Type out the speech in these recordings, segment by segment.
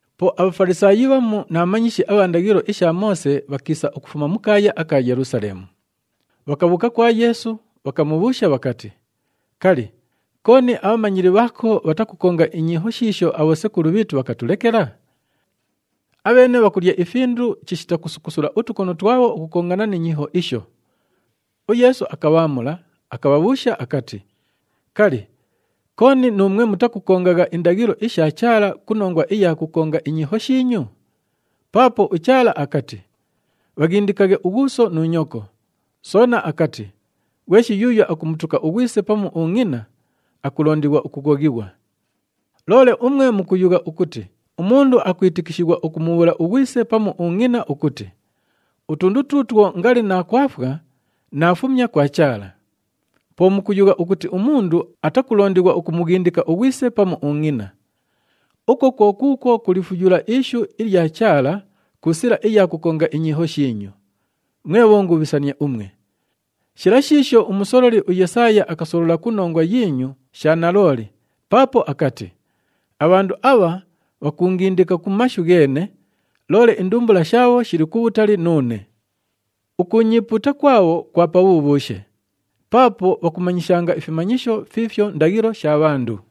Po aBhafalisaayi bhamu na bhamanyishi abha ndaghilo isha Moose bhakiisa ukufuma mu kaaya aka Yelusaleemu. Bhakabhuuka kwa Yeesu, bhakamubhuusha bhakati, “Kali, kooni abhamanyili bhaako bhatakukonga inyiiho shiisho abhosekulu bhiitu bhakatulekela? Abheene bhakulya ifindu chishita kusukusula utukono twabho ukukongana ni nyiiho isho!” UYeesu akabhaamula, akabhabhuusha akati, “Kali, kooni nuumwe mutakukongagha indaghilo isha Chaala ku nongwa iya kukonga inyiiho shiinyu? Paapo uChaala akati, ‘Bhaghindikaghe ughuuso nu nyoko.’ Soona akati, ‘Ghweshi yuuyo akumutuka ughwise pamu ungʼina, akulondighwa ukughoghighwa.’ Loole umwe mukuyugha ukuti umundu akwitikishighwa ukumubhuula ughwise pamu ungʼina ukuti, ‘Utundu tuutwo ngali naakwafwa, naafumya kwa Chaala.’ Po mukuyugha ukuti umundu atakulondighwa ukumughindika ughwise pamu ungʼina. Ukwo kwo kuukwo kulifuyula ishu ilya Chaala ku sila iya kukonga inyiiho shiinyu. Mwe bhongubhisania umwe! Shila shiisho umusololi uYesaaya akasolola ku nongwa yiinyu sha nalooli paapo akati, ‘Abhandu abha bhakuungindika ku mashu gheene, loole indumbula shaabho shili kubhutali nuune. Ukuunyiipuuta kwabho kwa pabhubhuushe! Paapo bhakumanyishanga ifimanyisho fiifyo ndaghilo sha bhandu.’”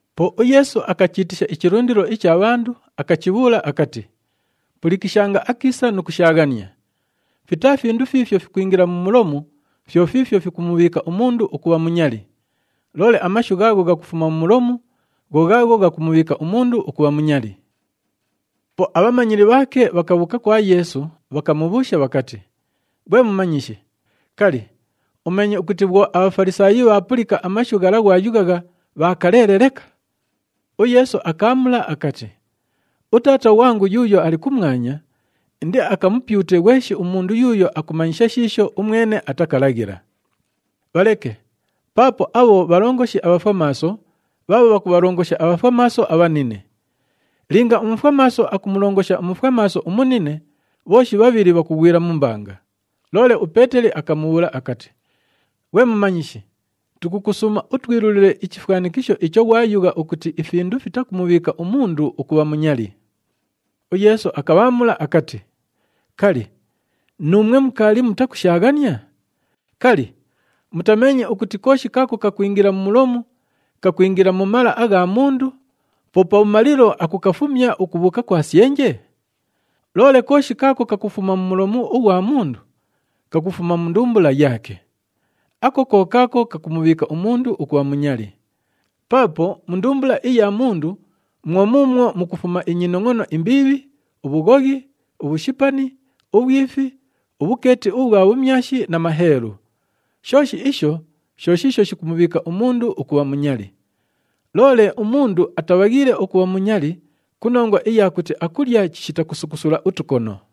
Po uYeesu akachiitisha ichilundilo icha bhandu, akachibhuula akati, “Pulikishanga akiisa nu kushaaghania! Fitaa findu fiifyo fikwingila mu mulomu, fyo fiifyo fikumubhiika umundu ukubha munyali. Loole amashu ghaagho ghakufuma mu mulomu, gho ghaagho ghakumubhiika umundu ukubha munyali.” Po abhamanyili bhaake bhakabhuuka kwa Yeesu, bhakamubhuusha bhakati, “Ghwe Mumanyishi, kali, umeenye ukuti bhwo aBhafalisaayi bhaapulika amashu ghala ghwayughagha, bhaakaleele leka?” UYeesu akaamula akati, “UTaata ghwangu yuuyo ali kumwanya indiakamupyute ghweshi umundu yuuyo akumanyisha shiisho umwene atakalaghila. Bhaleke, paapo abho bhalongoshi abhafwamaaso bhaabho bhakubhalongosha abhafwamaaso abhanine! Linga umufwamaaso akumulongosha umufwamaaso umunine, bhooshi bhabhili bhakughwila mu mbanga!” Loole uPeeteli akamubhuula akati, “Ghwe Mumanyishi, tukukusuuma utwilulile ichifwanikisho icho ghwayugha ukuti ifindu fitakumubhiika umundu ukubha munyali.” UYeesu akabhaamula akati, “Kali, nuumwe mukaali mutakushaaghania? Kali, mutameenye ukuti kooshi kaako kakwingila mu mulomu, kakwingila mu mala agha mundu, po pabhumalilo akukafumya ukubhuuka kwa syenje? Loole kooshi kaako kakufuma mu mulomu ughwa mundu, kakufuma mu ndumbula yaake. Ako ko kaako kakumubhiika umundu ukubha munyali. Paapo mu ndumbula iya mundu mwo muumwo mukufuma inyinongʼono imbiibhi, ubhughoghi, ubhushipani, ubhwifi, ubhukeeti ubhwa bhumyashi na maheelu. Shooshi isho sho shiisho shikumubhiika umundu ukubha munyali. Loole umundu atabhaghiile ukubha munyali ku nongwa iya kuti akulya chishita kusukusula utukono.”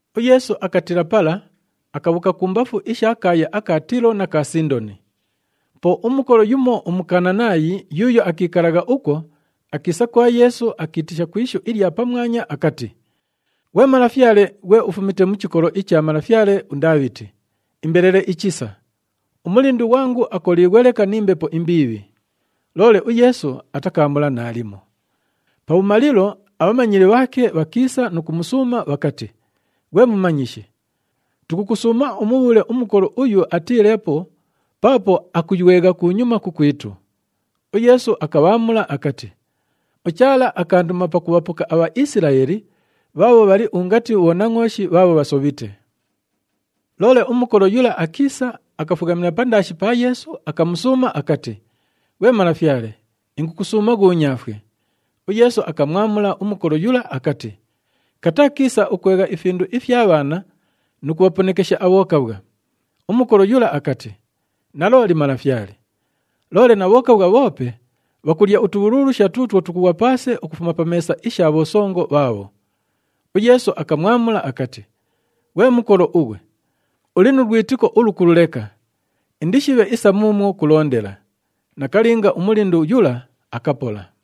UYeesu akatiila pala, akabhuuka kumbafu isha kaaya aka Tiilo na ka Sindoni. Po umukolo yumo uMukananaayi yuuyo akiikalagha ukwo, akiisa kwa Yeesu, akiitisha ku ishu ilya pamwanya akati, “Ghwe Malafyale, ghwe ufumite mu chikolo icha malafyale uNdaabhiti, imbelele ichisa! Umulindu ghwangu akoliighwe leka ni mbepo imbiibhi.” Loole uYeesu atakaamula naalimo. Pabhumalilo, abhamanyili bhaake bhakiisa nu kumusuuma bhakati, “Ghwe Mumanyishi, tukukusuuma umubhuule umukolo uyu atiileepo, paapo akuywegha kunyuma kukwitu.” UYeesu akabhaamula akati, “UChaala akaanduma pakubhapoka aBhaisilaeli bhaabho bhali ungati bhonangʼooshi bhaabho bhasobhite.” Loole umukolo yula akiisa, akafughamila pandaashi pa Yeesu, akamusuuma akati, “Ghwe Malafyale, ingukusuuma ghuunyaafwe!” UYeesu akamwamula umukolo yula akati, “Kataa kiisa ukwegha ifindu ifya bhaana nu kubhaponekesha abhokabhwa.” Umukolo yula akati, “Nalooli Malafyale, loole na bhokabhwa bhoope bhakulya utubhululusha tuutwo tukughwa paase ukufuma pa meesa isha bhosongo bhaabho.” UYeesu akamwamula akati, “Ghwe mukolo ughwe, uli nu lwitiko ulukulu leka! Indishibhe isa muumwo kulondela.” Nakalinga, umulindu yula akapola.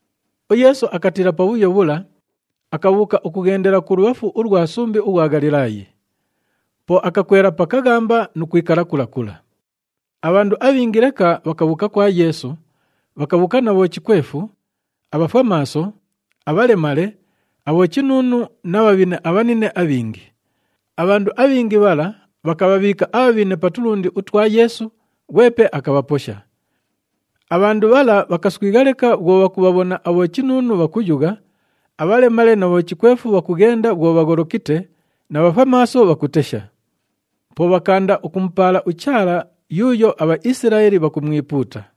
UYeesu akatiila pabhuyo bhula, akabhuuka ukughendela kulubhafu ulwa sumbi ughwa Ghalilaayi. Po akakwela pa kaghamba nu kwikala kula kula. Abhandu abhingi leka bhakabhuuka kwa Yeesu, bhakabhuuka na bhochikwefu, abhafwamaaso, abhalemale, abhochinuunu na bhabhine abhanine abhingi. Abhandu abhingi bhala bhakabhabhiika abhabhine pa tulundi utwa Yeesu, ghwepe akabhaposha. Abhandu bhala bhakaswigha leka bhwo bhakubhabhona abhochinuunu bhakuyugha, abhalemale na bhochikwefu bhakughenda bhwo bhagholokite na bhafwamaaso bhakutesha. Po bhakaanda ukumupaala uChaala yuuyo aBhaisilaeli bhakumwipuuta.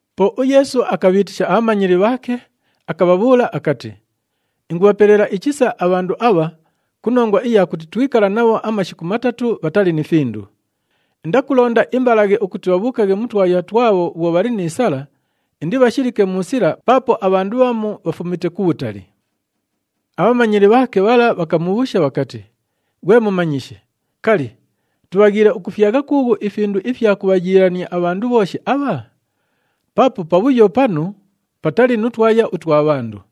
Po uYeesu akabhiitisha abhamanyili bhaake, akabhabhuula akati, “Ingubhapelela ichisa abhandu abha ku nongwa iya kuti twikala nabho amashiku matatu bhatali ni findu. Indakulonda imbalaghe ukuti bhabhuukaghe mu twaya twabho bhwo bhali ni sala, indibhashilike mu sila paapo abhandu bhamu bhafumite kubhutali.” Abhamanyili bhaake bhala bhakamubhuusha bhakati, “Ghwe Mumanyishi, kali, tubhaghiile ukufyagha kuughu ifindu ifya kubhayiilania abhandu bhooshi abha? Paapo pabhuyo panu patali nu twaya utwa bhandu.”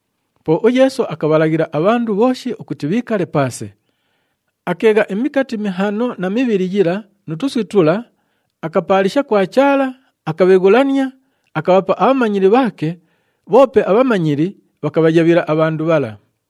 Po uYeesu akabhalaghila abhandu bhooshi ukuti bhiikale paase. Akeegha imikati mihaano na mibhili yila nu tuswi tula, akapaalisha kwa Chaala, akabheghulania, akabhapa abhamanyili bhaake, bhoope abhamanyili bhakabhayabhila abhandu bhala.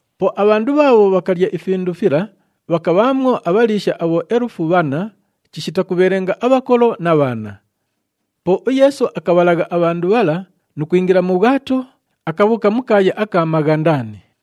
Po abhandu bhaabho bhakalya ifindu fila bhakabhaamwo abhaliisha abhoelufu bhanna chishita kubhelenga abhakolo na bhaana. Po uYeesu akabhalagha abhandu bhala nu kwingila mu bhwato, akabhuuka mu kaaya aka Maghandani.